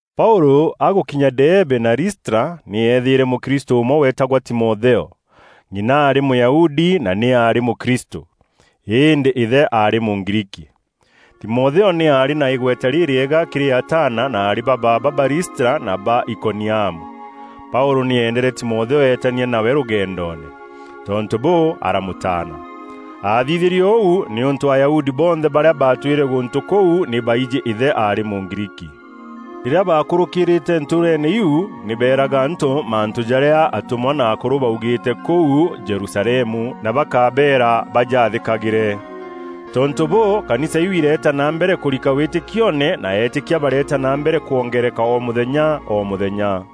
Paûlû agûkinya Deebe na Listra, nî eethîîre mûkristû ûmwe weetagwa Timotheo. Ng'ina aarî Mûyahudi na nî aarî mûkristû. Îndî îthe aarî Mûgriiki. Timotheo nî aarî na îgweta rîrîega kîrî ataana na aarî ba baaba ba Listra na ba Ikoniamu. Paûlû nî eendere Timotheo eetania nawe rûgendoone. Tontû bûû, aramûtaana. Aathithîrie ûu nîûntû Ayahudi bonthe barîa baatwîre gûntû kûu nî baijî îthe aarî Mûgriiki. Rîrîa baakûrûkîîrîte ntûûreene iu, nî beeraga antû mantû jarîa atûmwa na akûrû baaugîîte kûu Jerusalemu, na bakabeera bajaathîkagîre. Tontû bûû, kanisa iu ireeta na mbere kûrika wîtîkioone, na eetîkia bareeta na mbere kwongeereka o mûthenya o mûthenya.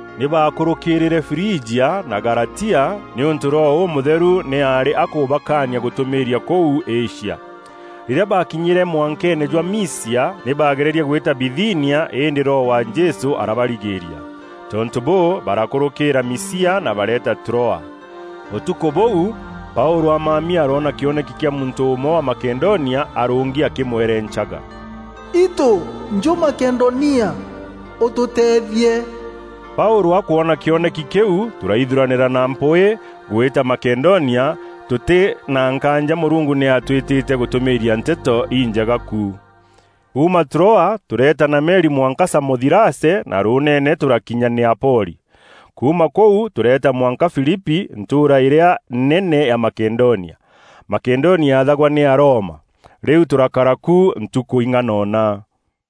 Nî baakûrûkîîrîre Frijia na Galatia, nîûntû Roho Ûmûtheru nî aarî akûbakania gûtûmîîria kûu Asia. Rîrîa baakinyîre mwankeene jwa Misia, nî baagererie gwîta Bithinia, îndî Roho wa Jesû arabarigîîria. Tontû bûû, barakûrûkîîra Misia na bareeta Troa. Ûtukû bûu, Paûlû amami aroona kîoneki kîa muntû ûmwe wa Makedonia arûngi akîmwerencaga: “Itû njû Makedonia ûtûteethie.” Paûlû akwona kîoneki kîu, tûraithuranîra na mpwîî gwîta Makedonia, tûtî na nkaanja Mûrungu nî atwîtîte gûtûmîîria Nteto Injega ku. Kuuma Troa tûreeta na meri mwanka Samothirace na rûûneene tûrakinya Neapoli. Kuuma kûu, tûreeta mwanka Filipi, ntûûra îrîa nene ya Makedonia. Makedonia yaathagwa nî Aroma. Rîu tûrakara ku ntukû ing'anona.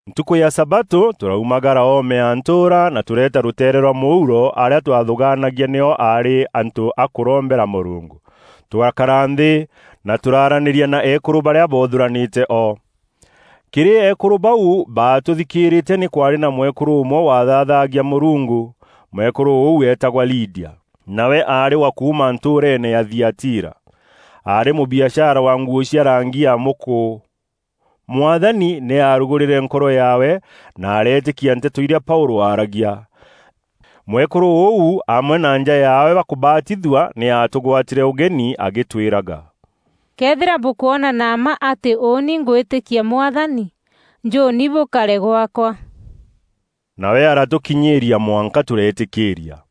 Ntukû ya sabatû tûraumagara oome ya ntûûra na tûreeta rûteere rwa mûuro, arîa twathûgaanagia nio aarî antû a kûrombera Mûrungu. Tûrakara nthî, na tûraaranîria na eekûrû barîa boothûranîte o. Kîrî eekûrû bau baatûthikîîrîte nî kwaarî na mwekûrû ûmwe waathaathagia Mûrungu. Mwekûrû ûu eetagwa Lidia. Nawe aarî wa kuuma ntûûreene ya Thiatira. Aarî mûbiashara wa nguû cia rangi ya mûkû. Mwathani nî aarugûrîre nkoro yaawe na areetîkia nteto irîa Paûlû aaragia. Mwekûrû ûu amwe na nja yaawe bakûbatithua, nî aatûgwatîre ûgeni agîtwîraga, “Këethîra bûkwona na mma atî ûûni ngwîtîkia Mwathani, njûûni bûkare gwaakwa.” Nawe aratûkinyîîria mwanka tûreetîkîîria.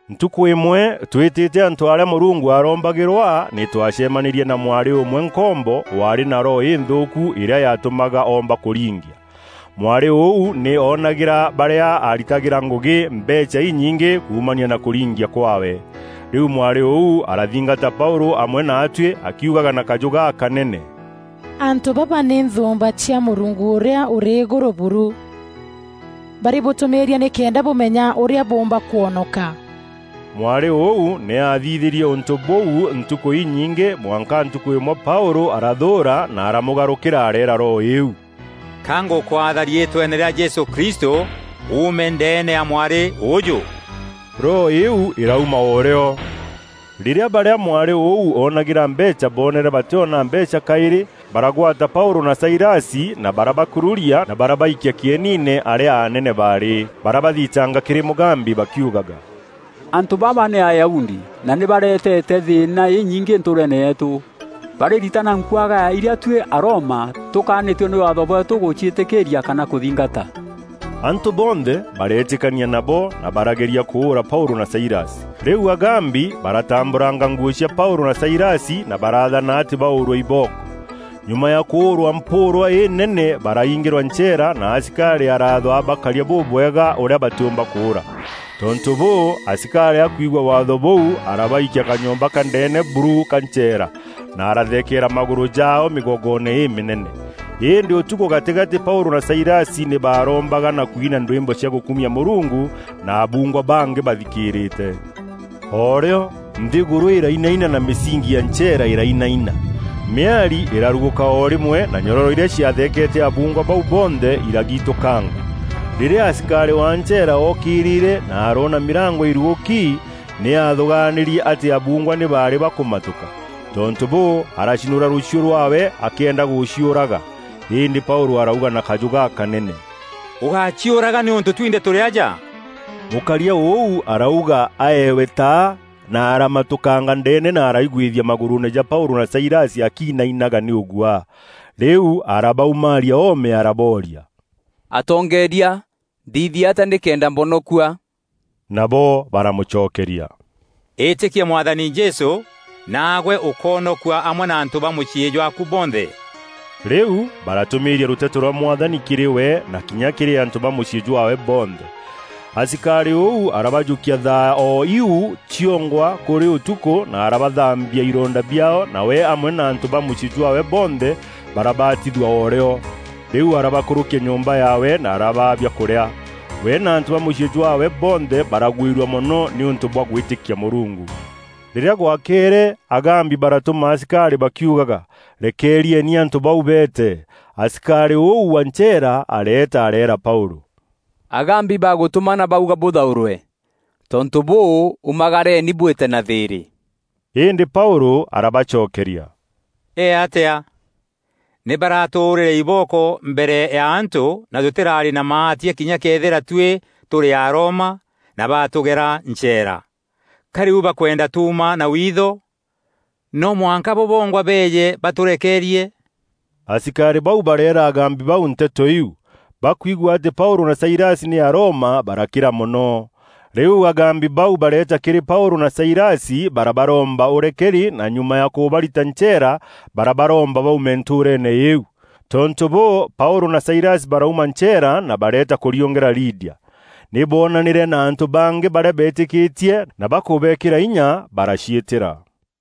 Ntukû îmwe tweetîte antû arîa Mûrungu aarombagîrwa, nî twaacemanîrie na mwarî ûmwe nkombo, waarî na roho înthûûku îrîa yaatûmaga oomba kûringia. Mwarî ûu nî oonagîra barîa aaritagîra ngûgî, mbeecha inyingî kuumania na kûringia kwaawe. Rîu mwarî ûu arathingata Paûlû amwe naatuî akiugaga na kajû gakanene, “Antû baba nî nthûûmba cia Mûrungu Ûrîa Ûrî Îgûrû buru! Barîbûtûmîîria nîkenda bûmenya ûrîa bûûmba kwonoka!” Mwarî ûu nî aathithîrie ûntû bûu ntukû inyingî mwanka ntukû îmwe Paûlû arathûûra na aramûgarûkîra areera roho îîu, “Ka ngûkwatha riîtweene rîa Jesû Kristû uume ndeene ya mwarî ûûjû!” Roho îîu îrauma o rîo. Rîrîa barîa mwarî ûu oonagîra mbeecha boonere batîona mbeecha kaîrî, baragwata Paûlû na Sailasi na barabakururia na barabaikia kîeniine arîa anene baarî. Barabathitanga kîrî mûgambi bakiugaga, “Antû baba nî Ayahudi na nî baretete thîîna inyingî ntûûreene yeetû. Barîritana nkuagaya irîa tuî Aroma tûkaanîtue nî waatho bweetû gûciîtîkîîria kana kûthingata.” Antû bonthe bareetîkania nabo, na barageria kûûra Paûlû na Sailasi. Rîu mûgambi baratambûranga nguû cia Paûlû na Sailasi na baraathana atî baûûrwe ibooko. Nyuma ya kûûrwa mpûûrwa înene baraingîrwa ncheera na asikarî araathwa abakarie bûbûbwega ûrîa batîûmba kûûra. Tontû bûû, asikarî akwigua waatho bûu arabaikia kanyomba ka ndeene buru ka ncheera na aratheekeera magûrû jaao mîgogoone îmînene. Îndî ûtukû gatîgatî Paûlû na Sailasi nî baarombaga na kwina ndwîmbo cia gûkumia Mûrungu, na abuungwa bangî bathikîîrîte. O rîo nthîgûrû îrainaina na mîsingi ya ncheera îrainaina. Mîari îrarugûka o rîmwe na nyororo irîa ciatheekete abuungwa bau bonthe îragitûkanga. Rîrîa asikarî wa ncheera ookîrîre na aroona mîrango îrugûki, nî aathûgaanîrie atî abuungwa nî baarî bakûmatûka. Tontû bûû, aracinûra rûchiû rwaawe akîenda gûciûraga. Îndî Paûlû arauga na kajû gakanene, “Ûgáciûraga nîûntû twinthe tûrî aja!” Mûkaria ûu arauga aewe taa na aramatûkanga ndeene na araigwithia magûrûûne ja Paûlû na Sailasi akiinainaga nî ûguaa. Rîu arabaumaaria oome arabooria, “Atongeeria, nthithie atîa nîkenda mbonokua?” Nabo baramûcokeria, “Îtîkia Mwathani Jesû naagwe ûkoonokua amwe na antû ba mûciî jwaaku bonthe.” Rîu baratûmîîria rûteto rwa Mwathani kîrî we na kinya kîrî antû ba mûciî jwaawe bonthe. Asikarî ûu arabajûkia thaa o iu ciongwa, kûrî ûtukû na arabathambia ironda biaao na we amwe na antû ba mûciî jwaawe bonthe barabatithua o rîo. Rîu arabakûrûkia nyomba yaawe na arabaa biakûrîa. We na antû ba mûciî jwaawe bonthe baragwîrua mono nîûntû bwa gwîtîkia Mûrungu. Rîrîa gwakere, mûgambi baratûma asikarî bakiugaga, “Rekeerieni antû bau beete.” Asikarî ûu wa ncheera areeta areera Paûlû, “Mûgambi bagûtûmana baûga bûthaûrwe. Tontû bûû, ûmagareeni bwîte na thîîrî.” Îndî Paûlû arabacokeria, “Ee atîa? Nî baraatûûrîre ibooko mbere ya antû na tûtîraarî na maatia kinya këthîra tuî tûrî Aroma na baatûgera ncheera. Ka rîu bakwenda tuuma na witho? No mwanka bo bongwa beeje batûrekeerie.” Asikarî bau bareera mûgambi bau nteto iu. Bakwigua atî Paûlû na Sailasi nî Aroma barakîra mono. Rîu mûgambi bau bareeta kîrî Paûlû na Sailasi bararomba ûrekeri na nyuma ya kûbarita ncheera, barabaromba baume ntûûreene îîu. Tontû bûû, Paûlû na Sailasi barauma ncheera, na bareeta kûriûngîra Lidia. Nî boonanîre na antû bangî barîa beetîkîtie na bakûbekîra inya baraciîtîra.